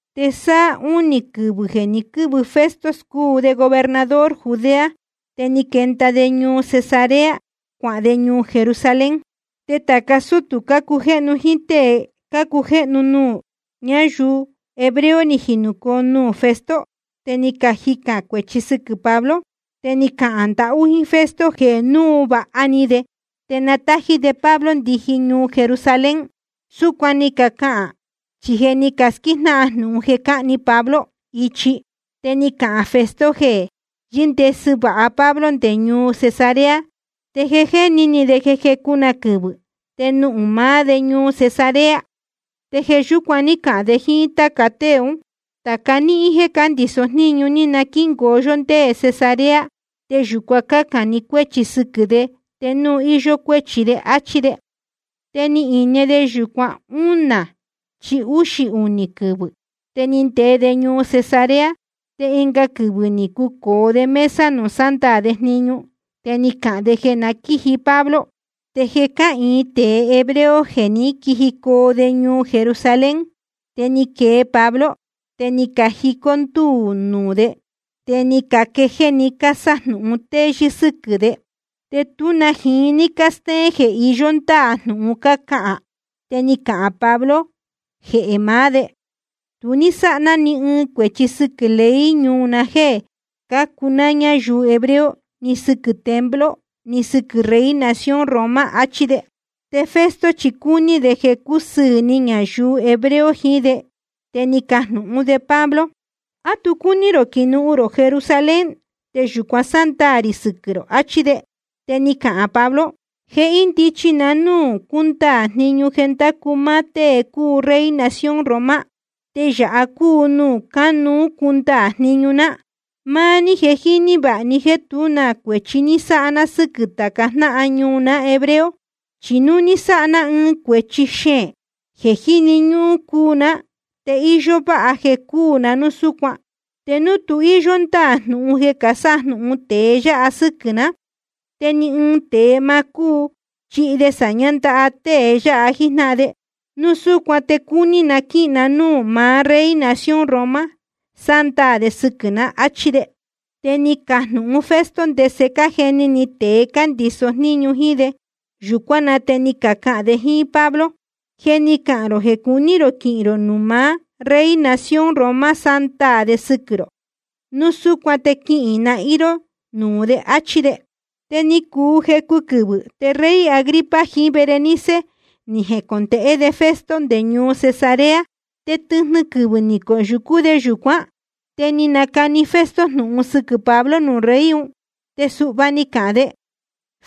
Te sáá únī quɨvɨ̄ jeē ni quɨ́vɨ Festo cuu de gobernador Judea, te ni quenda de ñuu Cesarea cuahān de ñuu Jerusalén. Te tāca sútū cácujéhnu jíín tée cácujéhnu nuū ñáyuu hebreo ni jinūcoo nuū Festo, te ni cajicān cuēchi sɨquɨ̄ Pablo. Te ni cacahān ndahú jíín Festo jeē núu vāha ni de te na nátají de Pablo ndiji ñuu Jerusalén. Súcuan ni cacahān, chi je ni casquíjnáhan jnūhun jeē cahni Pablo ichi. Te ni cahān Festo jeē yɨ́ndesɨ vāha Pablo nde ñuu Cesarea, te je jéni ni de jeē jecu na quɨvɨ̄ te nuhūn maá de ñuu Cesarea. Te jeē yúcuan ní cahān de jíín táca tée ún: Tāca níhín jeē cándīso jníñu, na quíngoo yó nde Cesarea, te yūcuan cácān ni cuéchi sɨquɨ̄ de te núu íyó cuéchi de, áchí de. Te ni ine de yūcuan únā chí úxī‑ni quɨvɨ̄, te ni ndee de ñuu Cesarea, te ɨnga quɨvɨ̄ ni cucōo de mesa nuū sándaā de jniñu, te ni cahān de jeē na quíji Pablo. Te je cáhīin tēe hebreo jeē ní quijicoo nde ñuu Jerusalén. Te ni quee Pablo, te ni cajicó ndúū nuū de, te ni caquejéé‑ni cásájnúhún téyɨ́ sɨ́quɨ̄ de, te tú na jiín ní cástéén jeē iyó ndáā jnūhun cácahān. Te ni cahān Pablo jehē maá de: Tu ní sáha ná ni ɨɨn cuēchi sɨquɨ̄ ley ñuu na jéē cácuu ná ñayuu hebreo, ni sɨquɨ̄ templo, ni sɨquɨ̄ rey nación Roma, achí de. Te Festo chi cúní de jeē cusɨɨ̄ ni ñayuu hebreo jiín de, te ni cajnūhún de Pablo: ¿A tu cúní rō quinuhun rō Jerusalén te yūcuan sándaā rī sɨquɨ̄ rō? achí de. Te ni cahān Pablo: Je índichi na núū cúndaā jniñu jeē ndácu máá tée cúu rey nación Roma, te yāha cúu nuū cánuú cundaā jniñu ná. Máá ní je jíní vāha ni jéē tú na cuēchi ní sáha ná sɨ́quɨ̄ tāca jnáhan ñuu ná hebreo. Chi núu ni sáha ná ɨɨn cuēchi xeēn jeē jíni ñúhún cuu ná, te íyó váha jeē cúū na núu súcuan. Te núu tu íyó ndáā jnūhun jeē casájnúhún tée yáha sɨ́quɨ̄ ná, te ni ɨɨn tēe ma cúu chihi de sāñá ndaha tēe yáha jíjnáhan de. Núu súcuan te cúní na quíhīn na núū maá rey nación Roma sándaā de sɨquɨ̄ na, áchí de. Te ni cajnūhun Festo ndese cájeni ni tēe cándīso jníñu jíín de. Yūcuán na te ni cahān de jíín Pablo: Je ni cahān rō jeē cuní rō quihīn rō nuū maá rey nación Roma sándaā de sɨquɨ̄ rō. Núu súcuan te quihīn nahín ró nuū de, áchí de. Te ni cuu jecu quɨvɨ̄, te rey Agripa jiín Berenice ni jecondēhé de Festo nde ñuu Cesarea. Te tɨjnɨ quɨvɨ̄ ni coyūcú de yūcuán. Te ni nacani Festo jnūhun sɨquɨ̄ Pablo nuū rey un. Te suhva ni cahān de: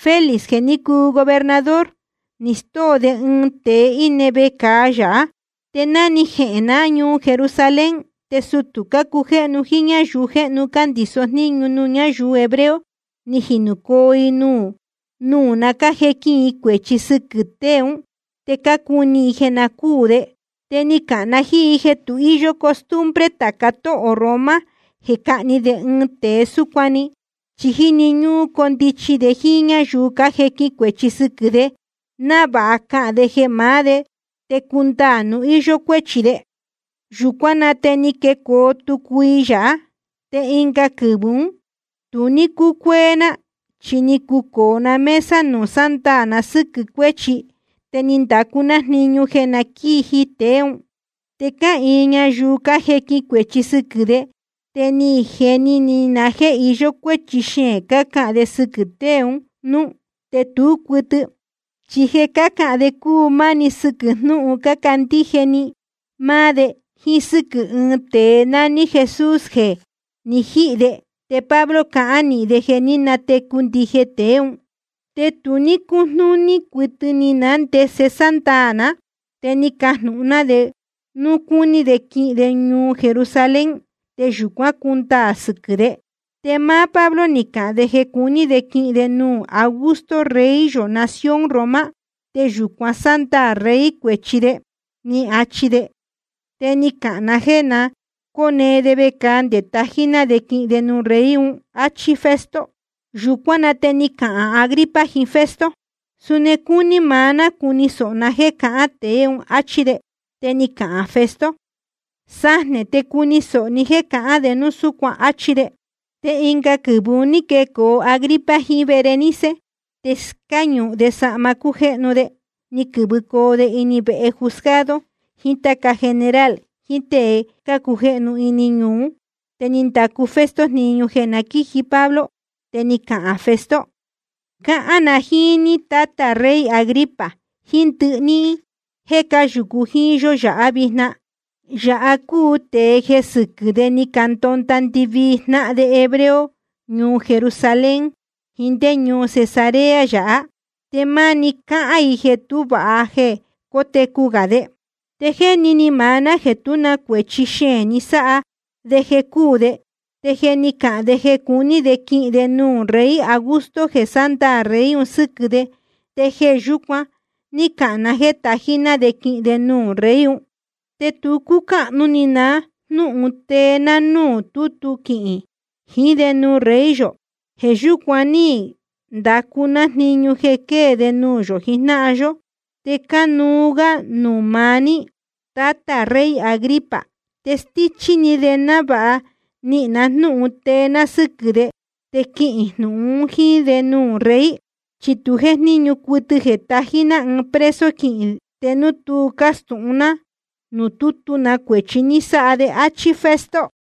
Félix jeē ní cuu de gobernador, ni stóo de ɨɨn tēe íne vecāa yāhá. Te ná ni jehēn ná ñuu Jerusalén, te sutū cácujéhnu jíín ñáyuu jéhnu cándīso jníñu nuū ñáyuu hebreo ni jinūcoo i nuū na cájequin i cuēchi sɨquɨ̄ tée ún, te cácuni i jeē na cúū de. Te ni cahān na jíín i jeē tu íyó costumbre tāca tóhō Roma jeē cahni de ɨɨn tēe súcuan‑ni, chi jíni ñúhún condichi de jíín ñáyuu cájequin cuēchi sɨquɨ̄ de, návāha cahān de jehē maá de te cundaā núu íyó cuéchi de. Yūcuán na te ni quecoo tútú i yāhá. Te ɨnga quɨvɨ̄ ún tu ní cúcuéé ná, chi ni cucōo na mesa nuū sándaā na sɨ́quɨ̄ cuéchi, te ni ndacu ná jniñu jeē na quíji tēe ún. Te cáhīin ñayuu cájequin cuēchi sɨquɨ̄ de. Te ni jeni ni na jéē iyó cuéchi xeēn cahān de sɨquɨ̄ tēe un núú, te tú cuɨtɨ. Chi jeē cácahān de cúu máni sɨquɨ̄ jnúhun cácandíje‑ni máá de, jíín sɨ́quɨ̄ ɨɨn tēe nání Jesús jeē jé ni jihī de, te Pablo cahán nīhin de jeē ní natecu ndije tēe ún. Te tu ní cújnúní cuɨtɨ ni ná ndese sándaā ná, te ni cajnūhun ná de núu cúní de quihīn de ñuu Jerusalén te yūcuán cundaā sɨquɨ̄ de. Te máá Pablo ni cahān de jeē cuní de quihīn de nuū Augusto, rey yō nación Roma, te yūcuan sándaā rey cuēchi de, ni achi de. Te ni cahān na jéē na cóne de vecāa nde tají ná de quihīn de nuū rey un, áchí Festo. Yūcuán na te ni cahān Agripa jiín Festo: Suni cúní maá ná cuni sōho ná jéē cahán tēe un, áchí de. Te ni cahān Festo: Sajnē te cuni sōho ní jéē cahán de núu súcuan, áchí de. Te ɨnga quɨvɨ̄ un ní quecoo Agripa jiín Berenice. Te cáñūhun de sahma cújéhnu de, ni quɨ̄vɨcoo de ini vehe juzgado jiín táca general jiín tée cácujéhnu ini ñuu ún. Te ni ndacu Festo jniñu jeē na quíji Pablo. Te ni cahān Festo: Cáhán na jíín ní, tátā rey Agripa, jíín ndɨhɨ níhín jéē cáyūcu jíín yó yāhá vijna. Yāha cúu tēe jeē sɨquɨ̄ de ni candonda ndɨvii jnáhan de hebreo ñuu Jerusalén jiín ndé ñuu Cesarea yāhá, te máni cácahān i jeē tú vāha jeē cótecu gā de. Te jéni ni maá ná jéē tú na cuēchi xeēn ni sáha de jeē cúū de. Te je ni cahān de jeē cuní de quihīn de nuū rey Augusto jeē sándaā rey un sɨ́quɨ̄ de, te jeē yúcuan ní cahān na jéē tají ná de quihīn de nuū rey un. Te tu cúcáhnu ni ná na jnūhun tee ná núū tútu quihīn jiín de nuū rey yō. Jeē yúcuan ní ndacu ná jniñu ni quee de nuū yō jijnáhan yó, te cánuú gá nuū maá ní, tátā rey Agripa. Te stíchí ni de návāha nihīn na jnúhun tee ná sɨ́quɨ̄ de, te quihīn jnūhun un jíín de nuū rey. Chi tu jéjníñu cuɨtɨ jeē tají ná ɨɨn preso quihīn te núu tú castūhun ná nuū tútu na cuēchi ni sáha de, áchí Festo.